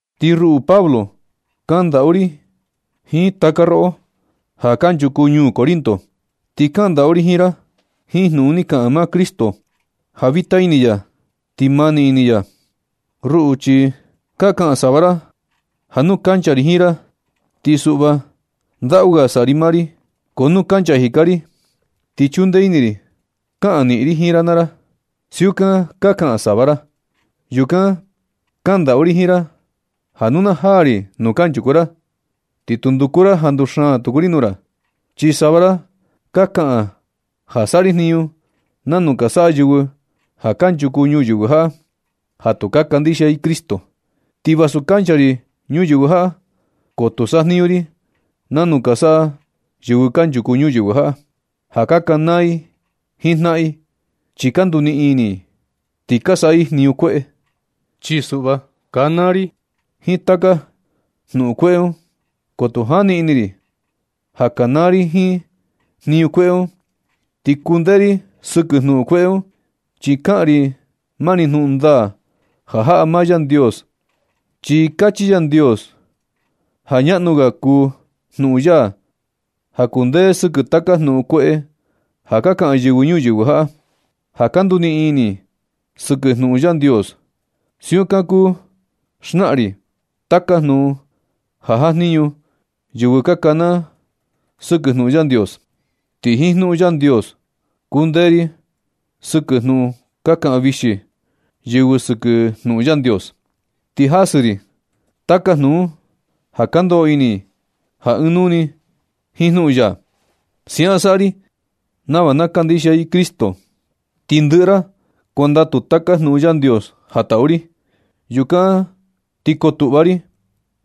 Ti ruꞌu Pablo, kaꞌan ndaꞌu ri jiin taka roꞌo, ja kanchuku ñuu Corinto, ti kaꞌan ndaꞌu ri jiin ra jiin jnuꞌun ni kaꞌan maa Cristo, ja vita ini ya ti mani ini ya. Ruꞌu, chi ka kaꞌan sava ra ja nu kancha ri jiin ra, ti suꞌva ndaꞌu ga saꞌa ri maa ri, ko nu kancha jika ri, chi chundee ini ri kaꞌan niꞌin ri jiin ra naa ra. Siukan ka kaꞌan sava ra. Yukan kaꞌan ndaꞌu ri jiin ra ja nu na jaa ri nuu kanchuku ra, ti tu nduku ra ja nduxaan tuku ri nuu ra. Chi sava ra ka kaꞌan ja saꞌa ri jniñu nanu ka saꞌa yɨvɨ ja kanchuku ñuyɨvɨ jaꞌa ja tu ka kandixia i Cristo. Ti vasu kancha ri ñuyɨvɨ jaꞌa, ko tu sajniñu ri nanu ka saꞌa yɨvɨ kanchuku ñuyɨvɨ jaꞌa, ja ka kanaa i jiin jnaꞌan i, chi ka nduniꞌin ini i, ti ka saꞌa i jniñu kueꞌe. Chi suꞌva kanaa ri jiin taka jnuꞌun kueꞌe un. Ko tu jani ini ri ja kanaa ri jiin jniñu kueꞌe un ti kundee ri jiin, ti kuu kundee ri sɨkɨ jnuꞌun kueꞌe un, chi kaꞌan ri mani jnuꞌun ndaa ja jaꞌa maa Yandios, chi kachi Yandios ja ñaꞌnu ga kuu jnuꞌun ya ja kundee sɨkɨ taka jnuꞌun kueꞌe ja ka kaꞌan yɨvɨ ñuyɨvɨ jaꞌa, ja ka nduniꞌin ini i sɨkɨ jnuꞌun Yandios. Siukan kuu xnaa ri taka jnuꞌun ja jajniñu yɨvɨ ka kanaa sɨkɨ jnuꞌun Yandios. Ti jiin jnuꞌun Yandios kundee ri sɨkɨ jnuꞌun ka kaꞌan vixi yɨvɨ sɨkɨ jnuꞌun Yandios. Ti jasɨ ri taka jnuꞌun un ja ka ndoꞌo ini i ja ɨɨn nuu jiin jnuꞌun ya. Siaꞌan saꞌa ri nava na kandixia i Cristo. Ti ndɨꞌɨ ra kuandatu taka jnuꞌun Yandios ja taꞌu ri. Yukan na ti kotuꞌva ri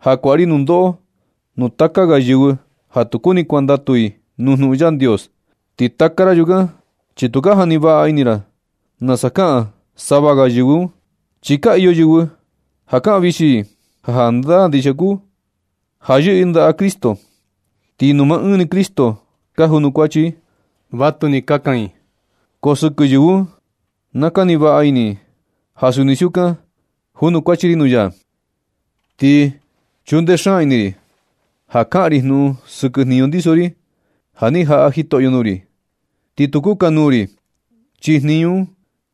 ja kuaꞌa ri nundoꞌo nuu taka ga yɨvɨ ja tu kuni kuandatu i nuu jnuꞌun Yandios. Ti taka ra yukan, chi tu ka jani vaꞌa ini ra nasa kaꞌan sava ga yɨvɨ un. Chi iyo yɨvɨ ja kaꞌan vixi i ja jandaa ndixia kuu ja yɨꞌɨ i ndaꞌa Cristo, ti nuu maa ɨɨn ni Cristo ka junukuachi i. Vatuni kaꞌan i, ko sɨkɨ yɨvɨ un na kani vaꞌa ini i ja suni siukan junukuachi ri nuu ya. Ti chundee xaan ini ri ja kaꞌan ri jnuꞌun sɨkɨ jniñu ndiso ri ja ni jaꞌa Jitoꞌyo nuu ri, ti tu kukanuu ri. Chi jniñu un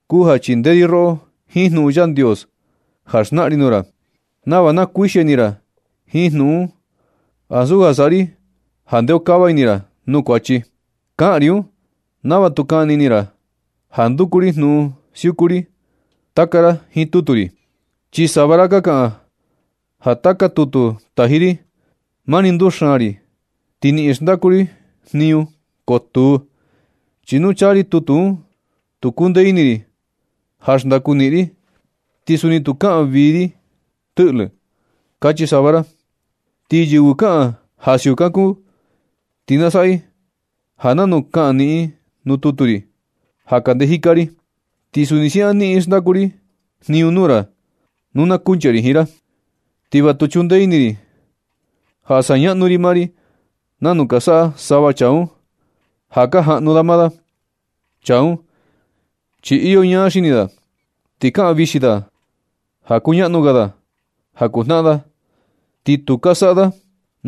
kuu ja chindee ri roꞌo jiin jnuꞌun Yandios, ja xnaꞌan ri nuu ra nava na kuixia ini ra jiin jnuꞌun un, ansu ja saꞌa ri ja ndeokava ini ra nuu kuachi. Kaꞌan ri un nava tu kani ini ra ja nduku ri jnuꞌun siuꞌu ri taka ra jiin tutu ri. Chi sava ra ka kaꞌan ja taka tutu taji ri, mani nduxaan ri ti niꞌin xndaku ri jniñu. Ko tuu, chi nu chaa ri tutu un tu kundee ini ri ja xndaku niꞌin ri. Ti suni tu kaꞌan vii ri tɨꞌlɨ, kachi sava ra. Ti yɨvɨ kaꞌan ja siukan kuu, ti na saꞌa i ja nanu kaꞌan niꞌin nuu tutu ri ja kande jika ri, ti suni siaꞌan niꞌin xndaku ri jniñu nuu ra nu na kuncha ri jiin ra. Ti va tu chundee ini ri ja saꞌa ñaꞌnu ri maa ri nanu ka saꞌa sava chaa un ja ka jajnuꞌun da maa da. Chaa un, chi iyo ñaa xini da, ti kaꞌan vixi da ja kuñaꞌnu ga da ja kuu jnaꞌan da. Ti tu ka saꞌa da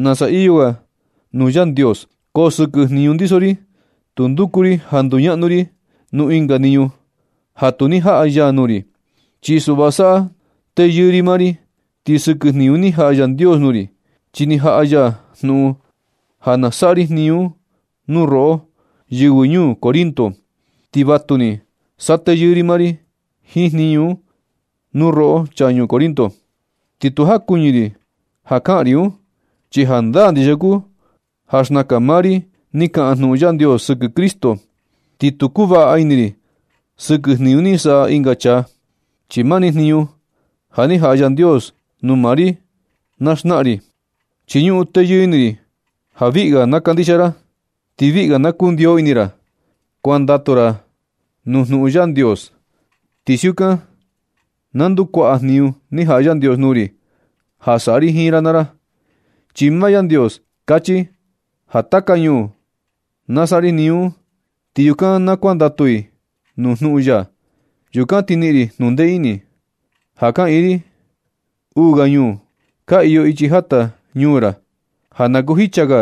nasa iyo ga nuu Yandios. Ko sɨkɨ jniñu ndiso ri, tu nduku ri ja nduñaꞌnu ri nuu ɨnga jniñu ja tu ni jaꞌa ya nuu ri. Chi suꞌva saꞌa teyɨɨ ri maa ri sɨkɨ jniñu ni jaꞌa Yandios nuu ri, chi ni jaꞌa ya jnuꞌun ja na saꞌa ri jniñu un nuu roꞌo, yɨvɨ ñuu Corinto. Ti vatuni saꞌa teyɨɨ ri maa ri jiin jniñu un nuu roꞌo chaa ñuu Corinto, ti tu jakuɨñɨ ri ja kaꞌan ri un, chi jandaa ndixia kuu ja xnakan maa ri ni kaꞌan jnuꞌun Yandios sɨkɨ Cristo. Ti tu kuvaꞌa ini ri sɨkɨ jniñu ni saꞌa ɨnga chaa, chi mani jniñu ja ni jaꞌa Yandios nuu maa ri na xnaꞌan ri. Chi ñuꞌun teyɨɨ ini ri ja viꞌi ga na kandixia ra, ti viꞌi ga na kundiyo ini ra kuandatu ra nuu jnuꞌun Yandios. Ti siukan na ndukuaꞌa jniñu ni jaꞌa Yandios nuu ri ja saꞌa ri jiin ra naa ra. Chi maa Yandios kachi ja taka ñuu na saꞌa ri jniñu un. Ti yukan na kuandatu i nuu jnuꞌun ya, yukan ti niꞌin ri jnundee ini. Ja na kiꞌin ri uu ga ñuu ka iyo ichi jata ñuu ra un, ja na kuu jicha ga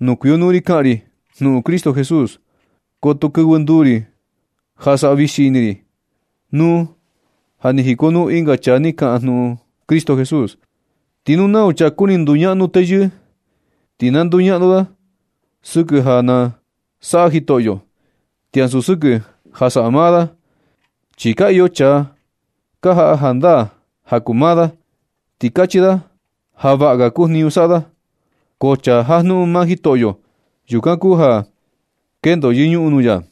nuu kuikonuu ri kaꞌan ri jnuꞌun Cristo Jesús. Ko tu kɨvɨ nduu ri ja saꞌa vixi ri ini ri nuu ja ni jikonuu ɨnga chaa ni kaꞌan jnuꞌun Cristo Jesús. Ti nu nau chaa kuni nduñaꞌnu teyɨɨ, ti na nduñaꞌnu da sɨkɨ ja na saꞌa Jitoꞌyo, ti ansu sɨkɨ ja saꞌa maa da. Chi ka iyo chaa ka jaꞌa jandaa ja kuu maa da, ti kachi da ja vaꞌa ga kuu jniñu saꞌa da. Ko chaa jajnuꞌun maa Jitoꞌyo, yukan kuu ja kendo yɨñuꞌun nuu ya.